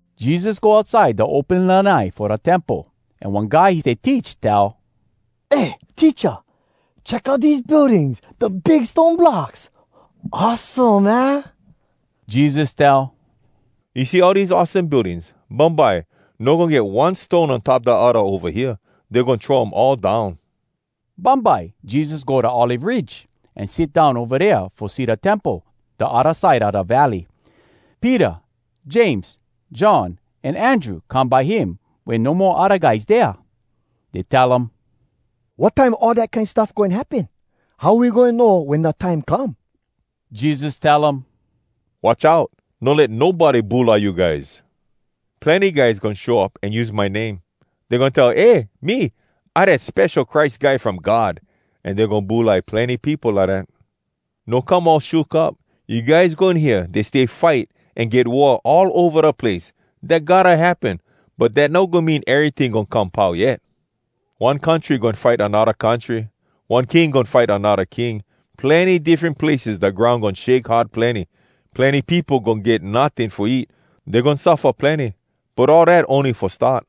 Jesus go outside da open lanai fo da Temple, an one guy he stay teach tell, “Eh, Teacha, check out dese buildings, da big stone blocks! Awesome, aah?” Jesus tell, “You see all dese awesome buildings? Bumbye no goin get one stone on top da odda ova hea. Dey goin throw um all down.” Bumbye, Jesus go da Olive Ridge, an sit down ova dea fo see da Temple da odda side a da valley. Peter, James, John, an Andrew come by him wen no mo odda guys dea. Dey tell um, “Wat time all dat kine stuff goin happen? How we goin know wen da time come?” Jesus tell um, “Watch out! No let nobody bulai you guys! Plenny guys goin show up an use my name. Dey goin tell, ‘Eh, me, I dat Spesho Christ Guy from God!’ An dey goin bulai plenny peopo lidat. No come all shook up. You guys goin hear, ‘Dey stay fight, an get war all ova da place.’ Dat gotta happen, but dat no goin mean eryting goin come pau yet. One country goin fight anodda country. One king goin fight anodda king. Plenny diffren places, da groun goin shake hard plenny. Plenny peopo goin get notting fo eat. Dey goin suffa plenny, but all dat ony fo start.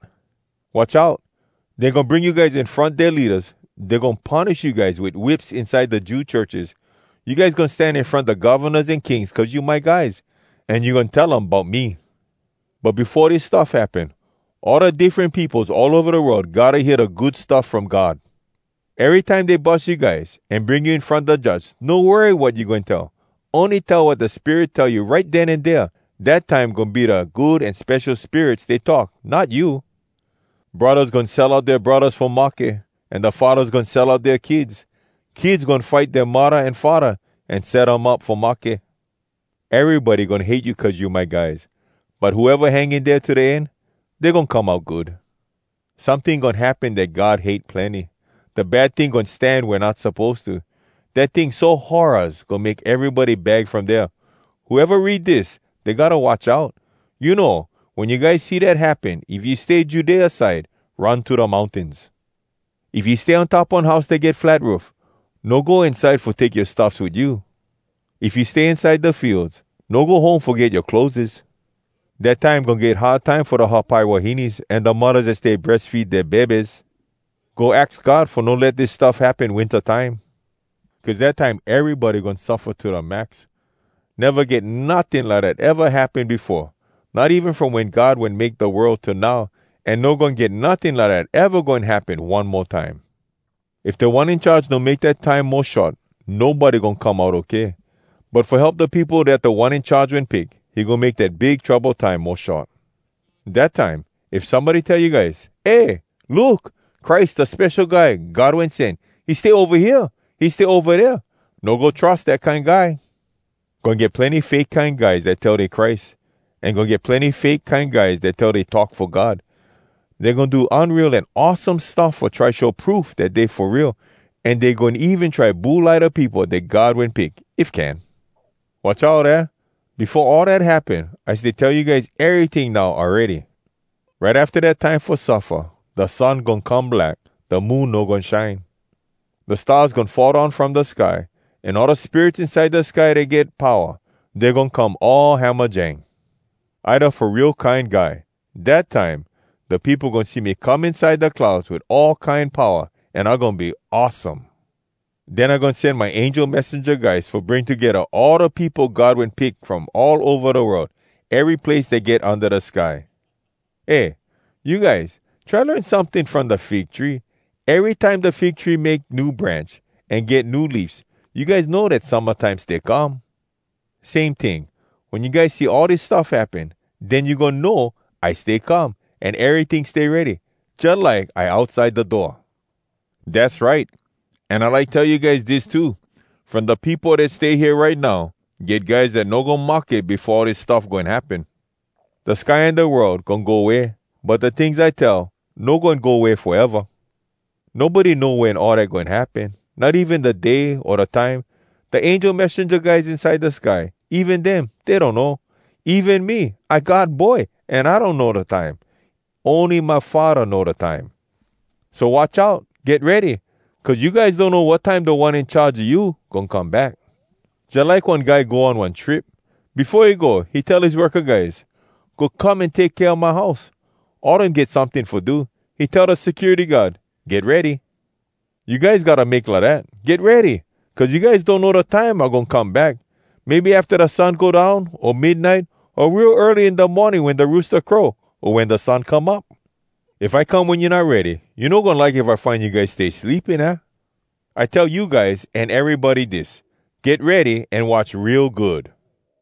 “Watch out! Dey goin bring you guys in front dea leadas. Dey goin punish you guys wit whips inside da Jew churches. You guys goin stan in front da govnas an kings, cuz you my guys. An you goin tell um bout me. But befo dis stuff happen, all da diffren peopos all ova da world gotta hear da Good Stuff From God. Erytime dey bus you guys, an bring you in front da judge, no worry wat you goin tell. Ony tell wat da Spirit tell you right den an dea. Dat time goin be da Good An Spesho Spirit stay talk, not you. Braddahs goin sell out dea braddahs fo mahke, an da faddahs goin sell out dea kids. Kids goin fight dea muddah an faddah, an set um up fo mahke. Erybody goin hate you cuz you my guys. But whoeva hang in dea to da end, dey goin come out good. “Someting goin happen dat God hate plenny. Da bad ting goin stan wea not suppose to. Dat ting so horraz, goin make erybody bag from dea. (Whoeva read dis, dey gotta watch out.) You know, wen you guys see dat happen, if you stay Judea side, run to da mountains. If you stay on top one house dat get flat roof, no go inside fo take yoa stuffs wit you. If you stay inside da fields, no go home fo get yoa clotheses. “Dat time goin get hard time fo da hapai wahines an da muddahs dat stay breas feed dea bebes! Go aks God fo no let dis stuff happen winta time. Cuz dat time erybody goin suffa to da max. Neva get notting lidat eva happen befo, not even from wen God wen make da world till now, an no goin get notting lidat eva goin happen one mo time. If Da One In Charge no make dat time mo short, nobody goin come out okay. But fo help da peopo dat Da One In Charge wen pick, he goin make dat big trouble time mo short. “Dat time, if somebody tell you guys, ‘Eh, look! Christ, da Spesho Guy God Wen Sen, he stay ova hea! He stay ova dea!’ no go trus dat kine guy! Goin get plenny fake kine guys dat tell dey Christ, an goin get plenny fake kine guys dat tell dey talk fo God. Dey goin do unreal an awesome stuff fo try show proof dat dey fo real, an dey goin even try bulai da peopo dat God wen pick, if can. Watch out, aah! Befo all dat happen, I stay tell you guys eryting now awready.” “Right afta dat time fo suffa, Da sun goin come black. Da moon no goin shine. Da stars goin fall down from da sky. An all da spirits inside da sky dat get powa, Dey goin come all hamajang. “I da Fo Real Kine Guy. Dat time, da peopo goin see me come inside da clouds wit all kine powa, an I goin be awesome! Den I goin sen my angel messenja guys fo bring togedda all da peopo God wen pick from all ova da world, ery place dat get unda da sky. “Eh, you guys, try learn someting from da fig tree. Erytime da fig tree make new branch an get new leafs, you guys know dat summa time stay come. Same ting, wen you guys see all dis stuff happen, den you goin know, I stay come, an eryting stay ready, jalike I outside da door. Dass right! An I like tell you guys dis too: From da peopo dat stay hea right now, get guys dat no goin mahke befo all dis stuff goin happen. Da sky an da world goin go way, but da tings I tell no goin go way foeva. “Nobody know wen all dat goin happen, not even da day, o da time. Da angel messenja guys inside da sky, even dem, dey donno. Even me, I God Boy, an I donno da time. Ony my Faddah know da time! So watch out! Get ready! Cuz you guys donno wat time Da One In Charge a you goin come back. Jalike one guy go on one trip. Befo he go, he tell his worka guys, ‘Go come an take kea my house.’ All dem get someting fo do. He tell da security guard, ‘Get ready!’ You guys gotta make lidat! Get ready! Cuz you guys donno da time I goin come back. Maybe afta da sun go down, o midnite, o real early in da morning wen da roosta crow, o wen da sun come up. If I come wen you not ready, you no goin like if I find you guys stay sleeping, aah? I tell you guys an erybody dis: Get ready an watch real good!”